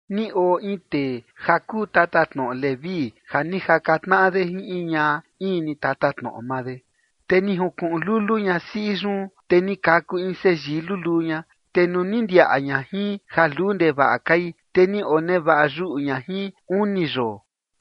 Ni oo in tee ja kuu tatatnoꞌo Leví ja ni jaka tnaꞌa de jin in ñaꞌa in ni tatatnoꞌo maa de. Te ni junkuꞌun lulu ñasiꞌi yun, te ni kaku in seyii luluu ña, te nuu ni ndiaꞌa ña jin ja luu ndevaꞌa kai, te ni onevaꞌa yuꞌu ña jin uni yoo.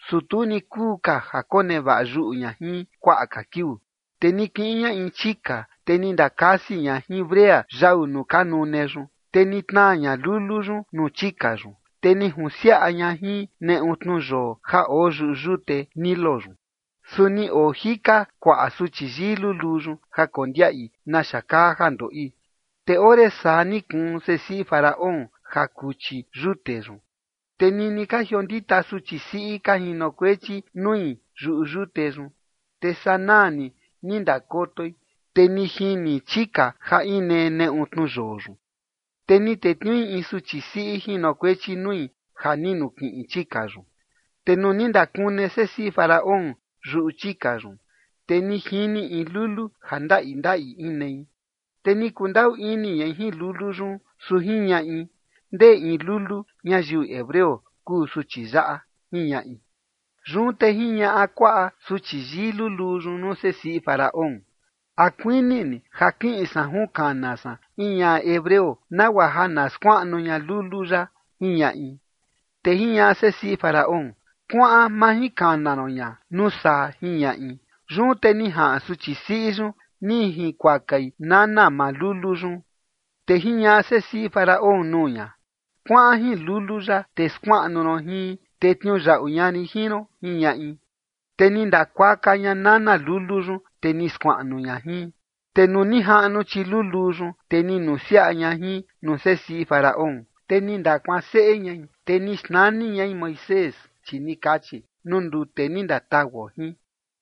Su tu ni kuu ka ja konevaꞌa yuꞌu ña jin kuaꞌa ka kiuu, te ni kiꞌin ña in chika, te ni ndakasi ña jin brea yau nuu ka nune yun, te ni tnaa ña lulu yun nuu chika yun, te ni junsiaꞌa ña jin neꞌu tnuyoo ja oo yuꞌu yute Nilo yun. Su ni oo jika kuaꞌa suchi yii luluu yun ja kondiaꞌi naxa kaa ja ndoꞌi. Te ore saa ni kuun sesiꞌi Faraón ja kuchi yute yun, te nini ka jiondita suchi siꞌi ka jinokuechi nui yuꞌu yute yun, te sanaa ni ni ndakotoi, te ni jini chika ja inee neꞌu tnuyoo yun. Te ni tetniui in suchi siꞌi jinokuechi nui ja ni nukiꞌin chika yun. Te nuu ni ndakune sesiꞌi Faraón yuꞌu chika yun, te ni jini in lulu ja ndaꞌi ndaꞌi inei. Te ni kundaꞌu ini ñai jin lulu yun, su jiñaꞌi: ―Ndee in lulu ñayiu hebreo kuu suchi yaꞌa ―jiñaꞌi. Yun te jiñaꞌa kuaꞌa suchi yii luluu yun nuu sesiꞌi Faraón: ―¿A kuini ni ja kiꞌin san junkana san in ñaꞌa hebreo, nagua ja na skuaꞌnu ña lulu yaꞌa? ―jiñaꞌi. Te jiñaꞌa sesiꞌi Faraón: ―Kuaꞌan majinkana ron ña nuu saa ―jiñaꞌi. Yun te ni jaꞌan suchi siꞌi yun ni jinkuakai nana maa lulu yun. Te jiñaꞌa sesiꞌi Faraón nuu ña: ―Kuaꞌan jin lulu yaꞌa, te skuaꞌnu ron jin, te tniuyaꞌu ña rin jin ron ―jiñaꞌi. Te ni ndakuaka ña nana lulu yun, te ni skuaꞌnu ña jin. Te nuu ni jaꞌnu chiluluu yun, te ni nusiaꞌa ña jin nuu sesiꞌi Faraón, te ni ndakuaan seꞌe ñai, te ni xnani ñai Moisés, chi ni kachi: “Nuu ndute ni ndatauo jin”.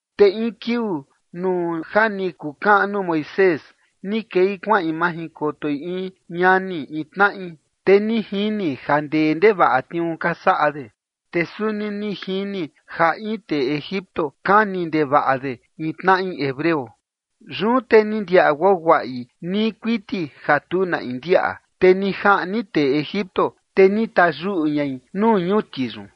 Te in kiuu nuu ja ni kukaꞌnu Moisés, ni kei kuaꞌin majinkotoi in ñani in tnaꞌi. Te ni jini ja ndee ndevaꞌa tniuu ka saꞌa de. Te suni ni jini ja in tee Egipto kani ndevaꞌa de in tnaꞌi hebreo. Yun te ni ndiaꞌa guaguaꞌi nii kuiti ja tu na in ndiaꞌa, te ni jaꞌni tee Egipto, te ni tayuꞌu ñai nuu ñuti yun.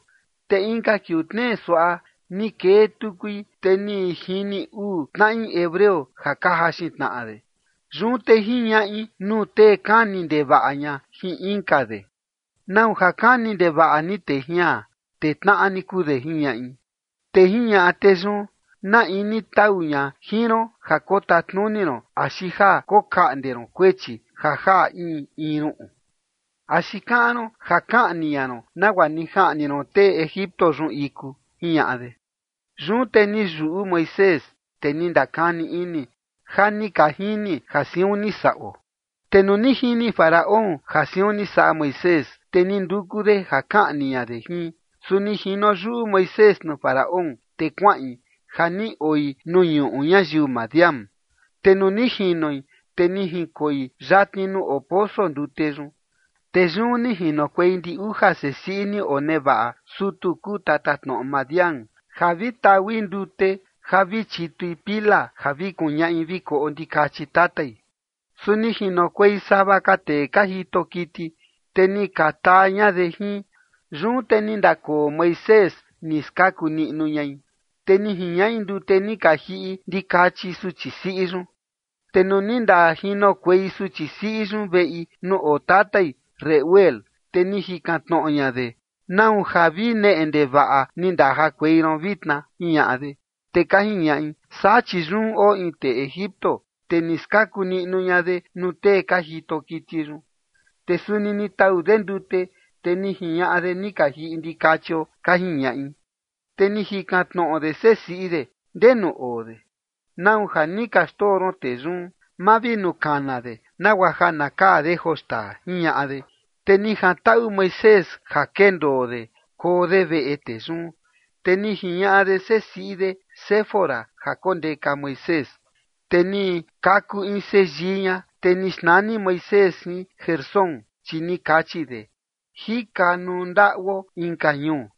Te inka kiuu tnee suaꞌa ni kee tukui, te ni jini uu tnaꞌi hebreo ja ka jaxin tnaꞌa de. Yun te jiñaꞌi nuu tee kani ndevaꞌa ña jin inka de: ―¿Nau ja kani ndevaꞌa ni tee jian, te tnaꞌa ni kuu de? ―jiñaꞌi. Te jiñaꞌa tee yun: ―¿Na in ni tau ña jin ron ja kotatnuni ron axi ja kokaꞌnde ron kuechi ja jaꞌa in in ruꞌun? ¿Axi kaꞌan ron ja kaꞌni ña ron nagua ni jaꞌni ron tee Egipto yun iku? ―jiñaꞌa de. Yun te ni yuꞌu Moisés, te ni ndakani ini: “Ja ni ka jini ja siun ni saꞌo”. Te nuu ni jini Faraón ja siun ni saꞌa Moisés, te ni nduku de ja kaꞌni ña de jin. Su ni jino yuꞌu Moisés nuu Faraón, te kuaꞌin ja ni oi nuu ñuꞌu ñayiu Madián. Te nuu ni jinoi, te ni jinkoi yatni nuu oo poso ndute yun. Te yun ni jinokuei ndi uja sesiꞌi ni onevaꞌa sutu kuu tatatnoꞌo Madián, ja vi taui ndute ja vi chitui pila ja vi kuñaꞌi vi koꞌo ndikachi tatai. Su ni jinokuei sava ka tee ka jito kiti, te ni ka taa ña de jin. Yun te ni ndakoo Moisés, ni skaku niꞌnu ñai, te ni jiñaꞌi ndute ni ka jiꞌi ndikachi suchi siꞌi yun. Te nuu ni ndajinokuei suchi siꞌi yun veꞌi nuu oo tatai Reuel, te ni jikan tnoꞌo ña de: ―¿Nau ja vi neꞌe ndevaꞌa ni ndajakuei ron vitna? ―jiñaꞌa de. Te ka jiñaꞌi: ―Saa chi yun oo in tee Egipto, te ni skaku niꞌnu ña de nuu tee ka jito kiti yun, te suni ni tau de ndute, te ni jiñaꞌa de ni ka jiꞌi ndikachio ―ka jiñaꞌi. Te ni jikan tnoꞌo de sesiꞌi de: ―¿Ndenu oo de? ¿Nau ja ni ka xndoo ron tee yun? Mavinukana de nagua ja na kaa de joo xtaa ―jiñaꞌa de. Te ni jantaꞌu Moisés ja kendoo de koo de veꞌe tee yun, te ni jiñaꞌa de sesiꞌi de Séfora ja kondeka Moisés. Te ni kaku in seyii ña, te ni xnani Moisés jin Gersón, chi ni kachi de: “Jika nuu ndaꞌuo inka ñuu”.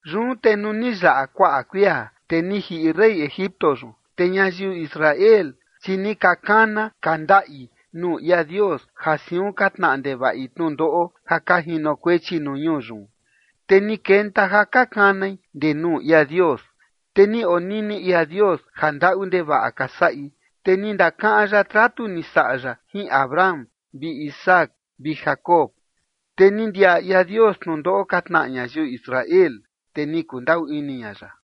Yun te nuu ni yaꞌa kuaꞌa kuia, te ni jiꞌi rey Egipto yun. Te ñayiu Israel, chi ni ka kana ka ndaꞌi nuu ia Dios ja siun ka tnaꞌa ndevaꞌi tnundoꞌo ja ka jinokuechi nuu ñuu yun, te ni kenta ja ka kanai ndee nuu ia Dios. Te ni onini ia Dios ja ndaꞌu ndevaꞌa ka saꞌi, te ndakaꞌan ya tratu ni saꞌa ya jin Abraham vi Isaac vi Jacob. Te ni ndiaꞌa ia Dios tnundoꞌo ka tnaꞌa ñayiu Israel, te ni kundaꞌu ini ña ya.